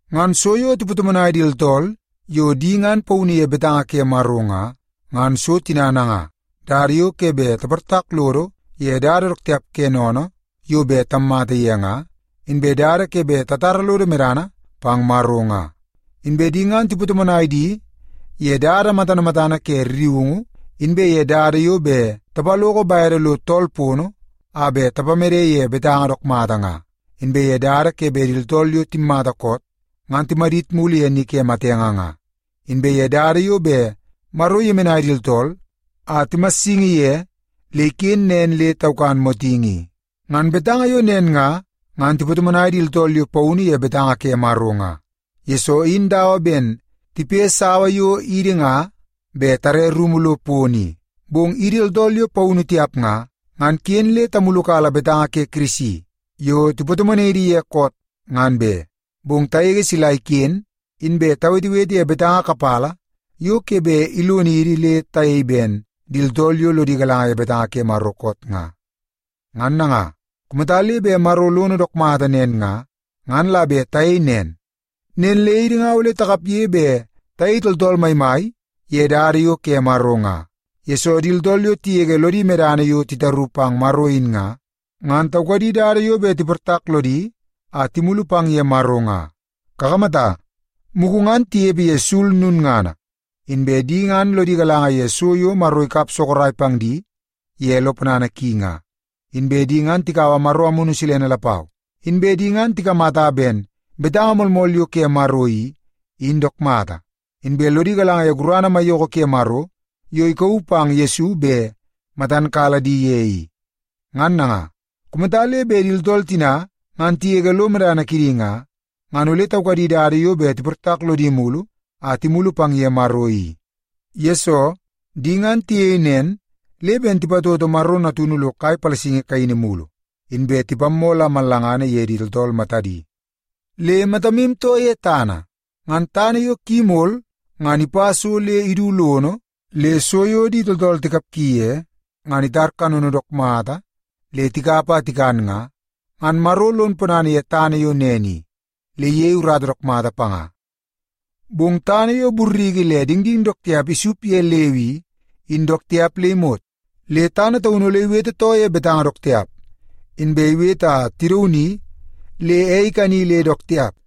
Ngan so yo tipatomonai di tooltool yo di ngan paunu ye betanga ke Maro nga, ngan so tina nanga: dada yo ke bet taportak lodo ye dada dook tiap ke sennene yo bet tammata ye nga, inbe dada ke bet tatara lodo medana pang Maro nga. Inbe di ngan tipatomonai di ye dada matana matana ke rriungu, inbe ye dada yo bet tapaloko bede lo tool pono a bet tapamede ye betanga dook mata nga, inbe ye dada ke bet di tooltool yo timmata koot ngan timadit ye ni ke matenge nga, inbe ye dada yo bet Maro iyemenai di tooltool a timassingi ye le iken nen le taukan motingi i. Ngan betanga yo nen nga, ngan tipatomonai di tooltool yo paunu ye betanga ke Maro nga, yesoo in dawa ben tipe sawa yo idi nga bet tare rumu lo pono i. Bong idi tooltool yo paunu tiap nga, ngan ken tamulukala betanga ke Kirisi yo tipatomonai idi ye koot, ngan be. Bong tagege sila iken inbe tawetewete ye betanga kapala yo ke bet ilonidi le tayei ben di tooltool yo lodi galanga ye betanga ke Maro koot nga. Ngan nanga, kumata le bet Maro lono dook mata nen nga, ngan la bet tayei nen. Nen le idi nga ole takapge bet tayei tooltool maimai ye dada yo ke Maro nga, yesoo di tooltool yo tigege lodi medana yo titaru pang Maro in nga, ngan taukadi dada yo bet tiportak lodi a timulu pang ye Maro nga. Kakamata, mugu ngan tinepe ye sul lulngana, inbe di ngan lodi galanga ye so yo Maro ikap sorok pang di ye lo ponana ki nga, inbe tikaua Maro Amunu Silene lapau. Inbe di ngan tikamata ben betanga moolmool yo ke Maro i, in dook mata. Inbe di ngan lodi galanga ye gurana maiyoko ke Maro yo ikauu pang Yesu bet matan kala di ye i. Ngan nanga, kumata le bet di tooltool tina ngan tigege lo medana kidi nga, ngan ole taukadi dada yo bet tiportak lodi mulu a timulu pang ye Maro i. Yesoo, di ngan tiyei nen le ben tipatoto Maro Natunu lo kai palasingi kaini mulu, inbe tipammoo la mallanga ye di tooltool matadi. Le matamu too ye tana. Ngan tana yo ki imol ngan ipa so le idu lono, le so yo di tooltool tikapgi ye ngan itar kanono dook mata le tikap a tikan nga, ngan Maro lon ponana ye tana yo nen i, le iyei urata dook mata panga. Bong tana yo burriki le dingding dook tiap isup ye leu i, in dook tiap le imot. Le tana taunu ole iwete too ye betanga dook tiap, inbe iwete a tidauni le ei ikani le dook tiap.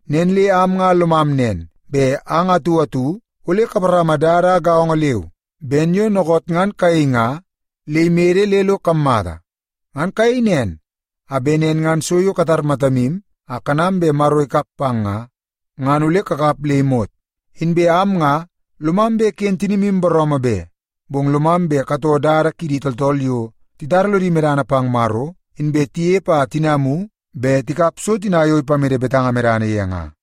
Nen le am nga lomam nen, bet ang atu atu ole kaparama dada gaongo leu ben yo dookoot ngan kayei nga le imede le lo kammata. Ngan kayei nen, a bet nen ngan so yo katar matamu a kanam bet Maro ikap pang nga, ngan ole kakap le imot. Inbe am nga lomam bet ken tinimu booroomoo be. Bong lomam bet katoo dada kidi tooltool yo titara lodi medana pang Maro, inbe tinepe a tinamu bet tikap so tina yo ipamede betanga medana ye nga.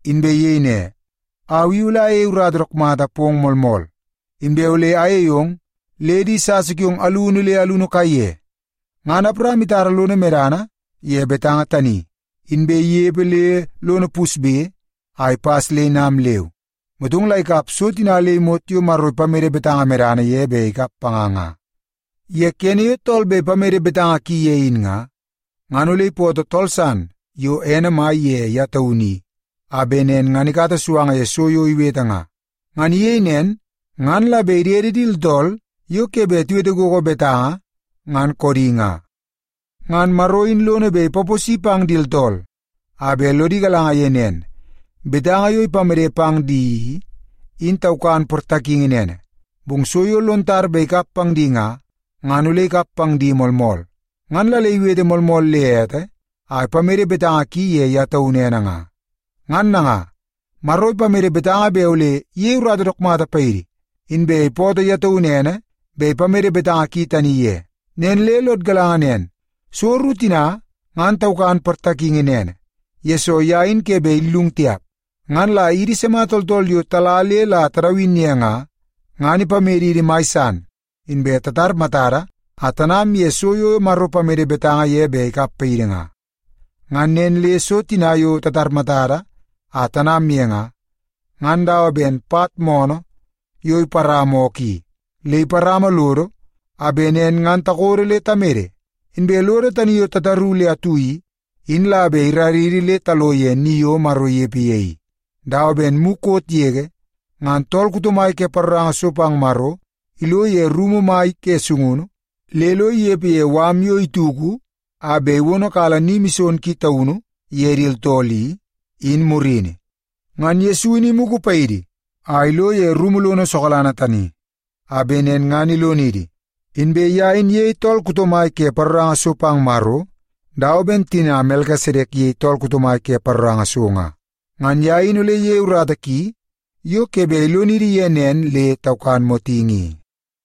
inbe iyei ne, “Au i ole ayei urata dook mata pong moolmool, inbe ole ayei ong le di sasa kiong alunu le alunu kaiye.” Ngan Awaram itara lono medana ye betanga tani, inbe inepe le lono pusbe a ipas le inam leu. Motong la ikap so tina le imot yo Maro ipamede betanga medana ye bet ikap panga nga. Ye kene yo tool bet ipamede betanga ki ye in nga, ngan ole ipootoo tool san yo ene mai ye ye taunu i, a bet nen ngan ikata suanga ye so yo iwete nga. Ngan iyei nen ngan la bet idede di tooltool yo ke bet tiwete gogo betanga, ngan koodi nga. Ngan Maro in lono bet ipaposi pang di tooltool a bet lodi galanga ye nen, betanga yo ipamede pang di i, in taukan portakingi nene, bong so yo lon tar bet ikap pang di nga, ngan ole ikap pang di moolmool. Ngan la le iwete moolmool le ete a ipamede betanga ki ye ye taunu ene nga. Ngan nanga, Maro ipamede betanga bet ole iyei urata dook mata paidi, inbe ipootoo ye taunu ene bet ipamede betanga ki tani ye. Nen le lod galanga nen, so ru tina, ngan taukan portakingi nene, yesoo ye in ke bet illung tiap. Ngan la idi sima tooltool yo tala le la tadawin ye nga, ngan ipamedidi mai san inbe tatar matada a tanam ye so yo Maro ipamede betanga ye bet ikap paidi nga. Ngan nen le so tina yo tatar matada a tanam ye nga, ngan dawa ben pat moonoo yo iparama ookoo i. Le iparama lodo a bet nen ngan takodo le tamede. Inbe lodo tani yo tataru le atu i, in la bet iraridi le talo ye ni yo Maro inepe ye i, dawa ben mukot yege ngan tool kuto mai ke paroranga so pang Maro ilo ye rumu mai ke sungunu le lo inepe ye mala yo ituku a bet iwonokala Ni Mison Ki Taunu ye di tooltool i, in murini. Ngan Yesu in imugu paidi a ilo ye rumu lono sokalanga tani, a bet nen ngan ilonidi. Inbe ye in iyei tool kuto mai ke paroranga so pang Maro dawa ben tina Melkisedek iyei tool kuto mai ke paroranga so nga. Ngan ye in ole iyeie urata ki yo ke bet ilonidi ye nen le taukan motingi i.